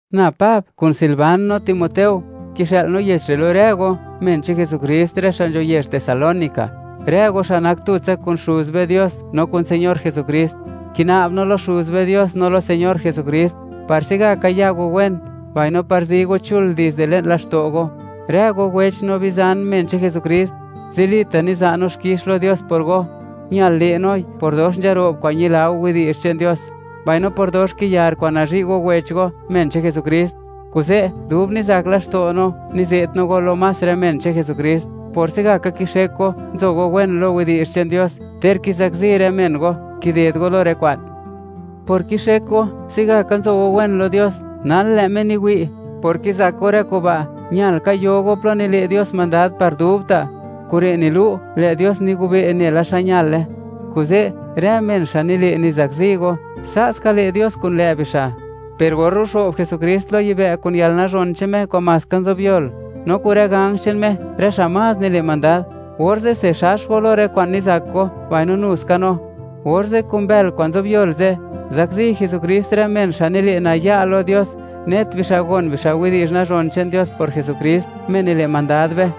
Na Pab kun Silvan no Timoteo; kixë'l no yech re' lo rë go, men che'n Jesukrist, rë xa' nzho yezh Tesalónica, rë go xa' nak tutsa kun Xuz be Dios no kun Señor Jesukrist. Kina'b no lo Xuz be Dios no lo Señor Jesukrist, par se'gaka ya go wen, mbaino par zi go chul dizde le'n laxto' go. Rë go wech no bizan, men che'n Jesukrist, zilita' niza' no xkix lo Dios por go. Ñal le' noi por dox nzaro'b kwa'n ñila go widi'zh che'n Dios, mbaino por dox kiyar kwa'n nazhi' go wech go, men che'n Jesukrist. Kuze', dub nizak laxto' no, nize't no go lo más rë men che'n Jesukrist, por se'gaka kixek go, nzo go wen lo widi'zh che'n Dios, ter kizakzi rë men go, kided go lo rë kwa'n. Por kixek go, se'gaka nzo go wen lo Dios, nal lë' Me niwi', por kizak go rë kuba', ñal ka yo go plo nile' Dios mandad par dubta'. Kure' nilu', lë' Dios nigobe' nela xa ñale. Kuze', rë men xa' nile' nizakzi go, sa' ska le' Dios kun lë' bixa'. Per or ruxo'b Jesukrist lo yibë' kun yalnazhon che'n Me kwa'n maska nzobyol, no kun rë ganj che'n Me, rë xa' más nile' mandad, orze'se xax go lo rë kwa'n nizak go, mbaino nu ska no. Orze' kun bël kwa'n nzobyol ze', zakzi Jesukrist rë men xa' nile' naya' lo Dios, net bixa' gon bixa' widi'zh nazhon che'n Dios por Jesukrist, Me nile' mandad be.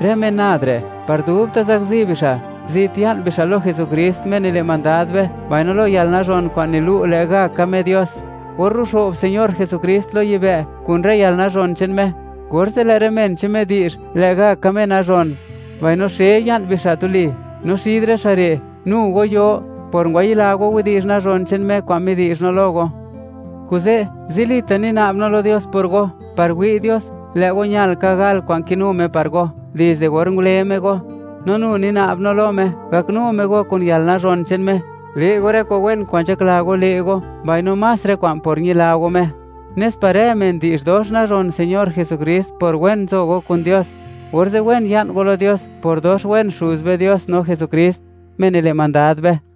Rë men nad re', par dubta' zakzi bixa'; zit ya'n bixa' lo Jesukrist, Me nile' mandad be, mbaino lo yalnazhon kwa'n nilu' lë'gaka Me Dios. Or ruxo'b Señor Jesukrist lo yibë' kun rë yalnazhon che'n Me, orze' lë' rë men che'n Me di'zh, lë'gaka Me nazhon, mbaino xe ya'n bixa' tuli; no xid rë xa' re', nu go yo, por ngwayila go widi'zh nazhon che'n Me kwa'n midi'zh no lo go. Kuze', zilita' nina'b no lo Dios por go, par wi' Dios, lë' go ñal ka gal kwa'n kinu Dios par go dizde or ngule Me go. No nu nina'b no lo Me, gaknu Me go kun yalnazhon che'n Me, le' go rë kwa'n wen kwa'n nzhakla go le' go, mbaino más rë kwa'n por ñila go Me, nes par rë men di'zh dox nazhon Señor Jesukrist por wen nzo go kun Dios, orze' wen ya'n go lo Dios, por dox wen Xuz be Dios no Jesukrist, Me nile' mandad be.